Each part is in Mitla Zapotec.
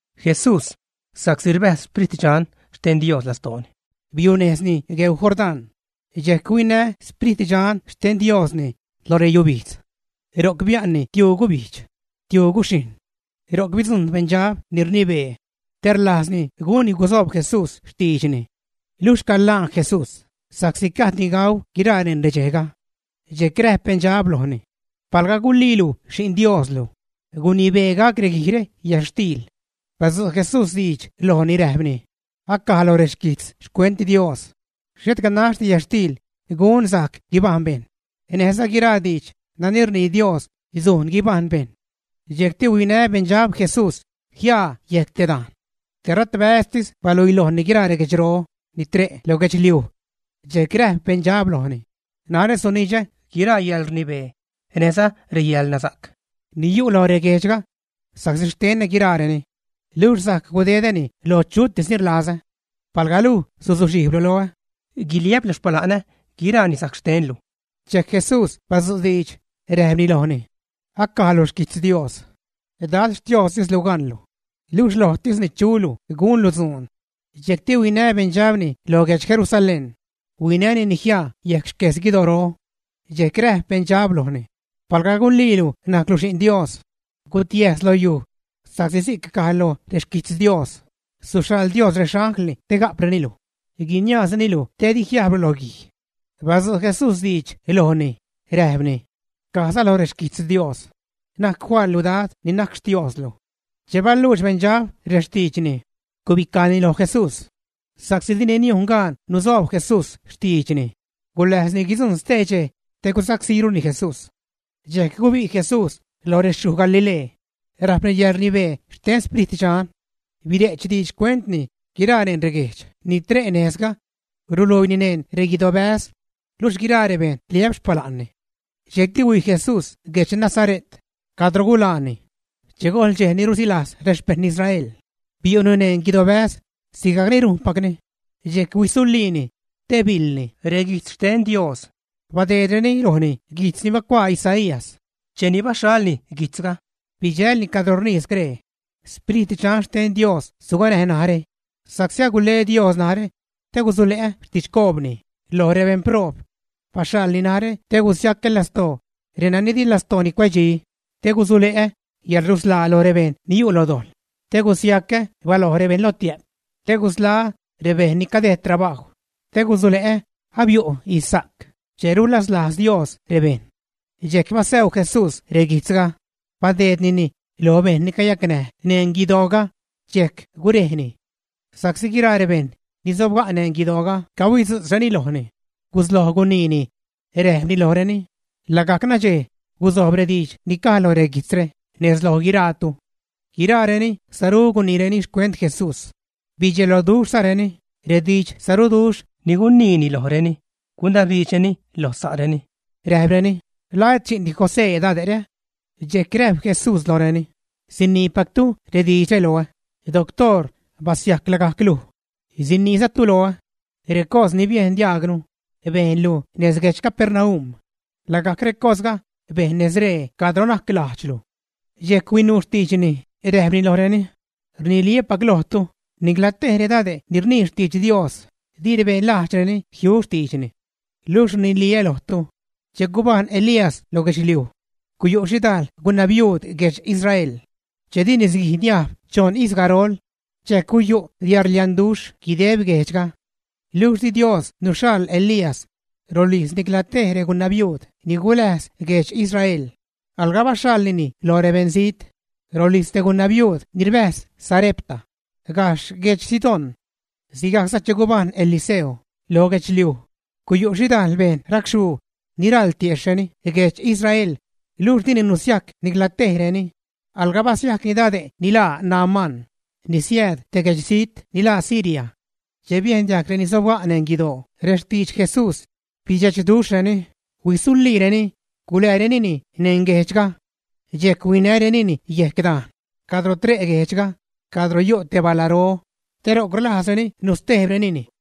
Jesús, sa'csi rbäjz Sprit Dxan xten Dios lastooni, biunejzni gueu Jordán, dxejc huinä Sprit Dxan xten Diosni lo reyubijdz. Ro'c bia'nni tiuu gubijdx, tiuu guxhijṉ. Ro'c bidzujṉ beṉdxab ni rnibee te rlajzni gunni gusoob Jesús xtiidxni. Luxh calaan Jesús, sa'csi gajdni gau guiraa neṉ redxejga. Dxejc räjp beṉdxab lojni: ―Palga guliilu Xi'n Dioslu, gunibee gac reguijre yätxtiil. Badzu' Jesús diidx lojni räjpni: ―Acaj loj reguijtz xcuent Dios: “Xhet ganaxdi yätxtiil gun sajc guibajṉ bejṉ, näjza guiraa diidx nani rnii Dios sujn guibajṉ bejṉ.” Dxejcti huinä beṉdxab Jesús jiaa yejc te dajn. Teratbäztis baluilojni guiraa reguedxro ni tre' lo guedxliuj. Dxejc räjp beṉdxab lojni: ―Narä sunidxä guiraa yäḻrnibee näjza reyäḻnasa'c ni yu' loj reguejdxga sa'csi xtenä guiraareni, luxh sajc gudedäni lo chutis ni rlazä. Palga luj suzuxhijblu loä, guiliä'plu xpala'nä, guiraani sajc xtenlu. Dxejc Jesús badzu' diidx, räjpni lojni: ―Acaj loj xquijtz Dios: “Dad Xtiostislu gaṉlu, luxh lojtisni chulu gunlu dzuun.” Dxejcti huinä beṉdxabni lo guedx Jerusalén, huinänini jiaa yejc xques guidoro. Dxejc räjp beṉdxab lojni: ―Palga guliilu najclu Xi'n Dios, gutiäjs lo yuj sa'csi si'c caj loj rexquijtz Dios: Suxhaḻ Dios rexanglni te ga'preni luj, guiniaazreni luj didi jiajblu lo guij. Badzu' Jesús diidx lojni, räjpni: ―Cajza lo rexquijtz Dios: “Na'c faḻlu Dad ni najc Xtioozlu.” Che baluux beṉdxab rextiidxni, gubicajni lo Jesús sa'csi dini niujn gaan nusoob Jesús xtiidxni. Guläjzni guidzujṉ stee dxej te gusacsíruni Jesús. Dxejc gubi' Jesús lo rexyuj Galilee räjpni yäḻrnibee xten Sprit Dxan. Bire'ch diidx xcuentni guiraa neṉ reguejdx ni tre' nejzga. Ruluiini neṉ reguidobäz luxh guiraa rebejṉ rliä'p xpala'nni. Dxejcti huij Jesús guedx Nazare't cadro gulaani. Che gojl dxej ni rusilajz rexpejṉ Israel, biu'ni neṉ guidobäz sigajc ni rujnpacni, dxejc huisuliini te biḻni reguijtz xten Dios. Badeedreni lojni guijtz ni bacuaa Isaías; cheni baxhalni guijtzga, bidxälni cadro rnii scree: Sprit Dxan xten Dios suganäj narä, sa'csi agule Dios narä te gusule'ä xtidxcoobni lo rebeṉproob. Baxhaḻni narä te gusiacä lastoo renani di lastooreni cuedxi, te gusule'ä yäḻrusḻaa lo rebejṉ ni yu' lo dojḻ, te gusiacä baloj rebeṉ lotiä'p, te gusḻaä́ rebeṉ ni cadejd trabajw, te gusule'ä abiu' ijzsa'c che rulaslajz Dios rebejṉ. Dxejc basäu Jesús reguijtzga, badeednini loj bejṉ ni cayacnäj neṉ guidooga, dxejc gurejni. Sa'csi guiraa rebejṉ ni sobga' neṉ guidooga cahuidzu'tzreni lojni, gusloj guniini, räjpni lojreni: ―Lagajc nadxej guzojb rediidx ni caj lo reguijtzre nez loj guiraatu. Guiraareni sarú guniireni xcuent Jesús, bedxeloduxhzareni redidxsaruduxh ni guniini lojreni. Gunabdiidxreni loj sa'reni, räjpreni: ―¿La et xi'ndi José dade're, ä? Dxejc räjp Jesús lojreni: ―Siniipactu rediidxre loä: “Doctoor, basiajc lagajc luj”; siniizatu loä: “Recos ni biejn diajgnu bejnlu nez guedx Capernaum, lagajc recosga bejn nez ree cadro najc lajdxlu.” Dxejc huinuu xtiidxni, räjpni lojreni: ―Rniliä́pac lojtu, nicla tej redade' ni rnii xtidx Dios, di rebeṉ lajdxreni jiu xtiidxni. Luxh rniliä lojtu, che gubajṉ Elías lo guedxliuj, guyu' xhidajl gunabiuud guedx Israel che di nisguij niajb choṉ ijz garol, dxejc guyu' yäḻrlianduxh guideb guejdxga. Luxh di Dios nuxhaḻ Elías rolijz nicla tej regunabiuud ni guläjz guedx Israel, alga baxhaḻnini lo beṉzijt, rolijz te gunabiuud ni rbäjz Sarepta, gajxh guedx Sidón. Sigajcza che gubajṉ Eliseo lo guedxliuj, guyu' xhidajl beṉ racxhuu ni raḻ tiejxhreni guedx Israel, luxh dini nusiajc nicla tejreni, alga basiajcni dade' ni laa Naamán, ni siääd te guedxzijt ni laa Siria. Che biejn diajg reni sobga' neṉ guidoo rextidx Jesús, bidxechduxhreni, huisuliireni, guläärenini neṉ guejdxga. Dxejc huinärenini yejc dajn cadro tre' guejdxga cadro yu' te balaro, te ro'c rlajzreni nustejbrenini.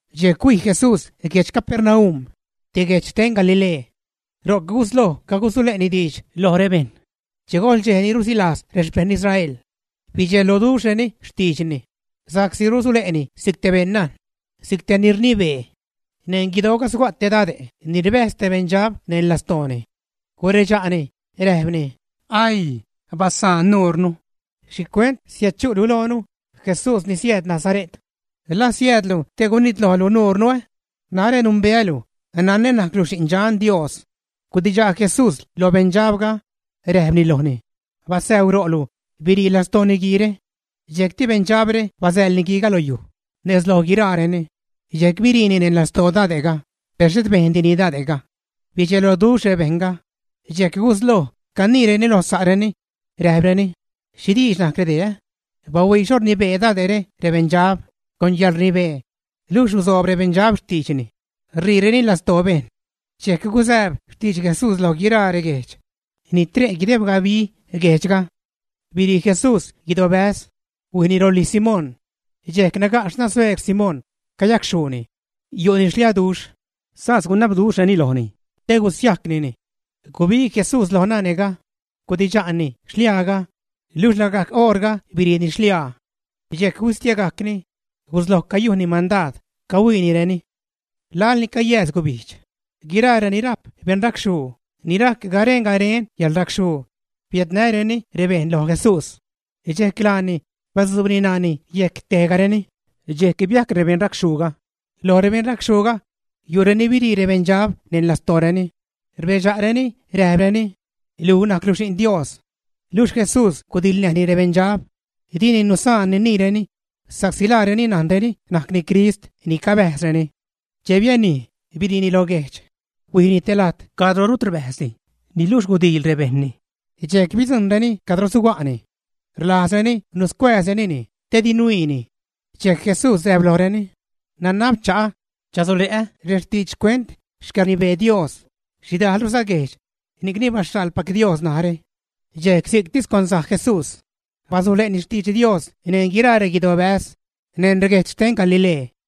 Dxejc huij Jesús guedx Capernaum, te guejdx xten Galilee. Ro'c gusloj cagusule'ni diidx loj rebejṉ che gojl dxej ni rusilajz rexpejṉ Israel. Bidxeloduxhreni xtiidxni sa'csi rusule'ni si'c te beṉnajn, si'c te ni rnibee. Neṉ guidooga suga' te dade' ni rbäjz te beṉdxab neṉ lastooni. Guredxa'ni räjpni: ―¡Aii! ¡Basaan nurnu! ¿Xhicuent riädchu'lu loonu Jesús ni siääd Nasare't? ¿La siäädlu te gunitlojlu nuurnu, ä? Narä numbeälu, nanä najclu Xin Dxan Dios. Gudidxa' Jesús lo beṉdxabga, räjpni lojni: ―Basäu ro'lu, birii lastoo niguiire. Dxejcti beṉdxabre basäḻ niguiiga lo yuj nez loj guiraareni, dxejc biriini neṉ lastoo dade'ga, per xhet bejndini dade'ga. Bidxeloduxh rebejṉga, dxejc gusloj caniireni lo sa'reni, räjpreni: ―¿Xhi diidx najc redee? Bahuii xho rnibee dade're rebeṉdxab con yäḻrnibee, luxh rusoob rebeṉdxab xtiidxni, ṟiireni lastoo bejṉ. Dxejc gusääb xtidx Jesús lo guiraa reguejdx ni tre' guideb gabi guejdxga. Birii Jesús guidobäz, huijni rolijz Simón. Dxejc naga' xnan sueerg Simón, cayacxhuuni, yu'ni xliaduxh. Sas gunabduxhreni lojni te gusiajcnini. Gubig Jesús loj nane'ga, gudidxa'ni xliaaga, luxh lagajc oṟga biriini xliaa. Dxejc huistiegajcni, gusloj cayujnni mandaad, cahuiinireni. Laḻ ni cayääz gubijdx, guiraa reni rajp beṉracxhuu ni rajc garen garen yäḻracxhuu biädnäreni rebejṉga lo Jesús. Dxejc laani batzuubni ṉaani yejc tejgareni, dxejc biajc rebeṉracxhuuga. Loj rebeṉracxhuuga, yu'reni birii rebeṉdxab neṉ lastooreni, rbedxa'reni räjpreni: ―Luj najclu Xi'n Dios. Luxh Jesús gudiḻnäjni rebeṉdxab, dini nusaa niniireni sa'csi laareni najnreni najcni Crist ni cabäjzreni. Che bianij, biriini lo guejdx, huijni te lajt cadro rut rbäjzdi. Niluxh gudiil rebejṉni, dxejc bidzujṉreni cadro suga'ni. Rlajzreni nuscuääzrenini te di nuiini. Dxejc Jesús räjp lojreni: ―Nanab cha'a chasule'ä rextidx xcuent xcäḻrnibee Dios xhidajlruza guejdx, ni'cni baxhaḻpac Dios narä. Dxejc si'ctis cuanzaj Jesús basule'ni xtidx Dios neṉ guiraa reguidobäz neṉ reguejdx xten Galilee.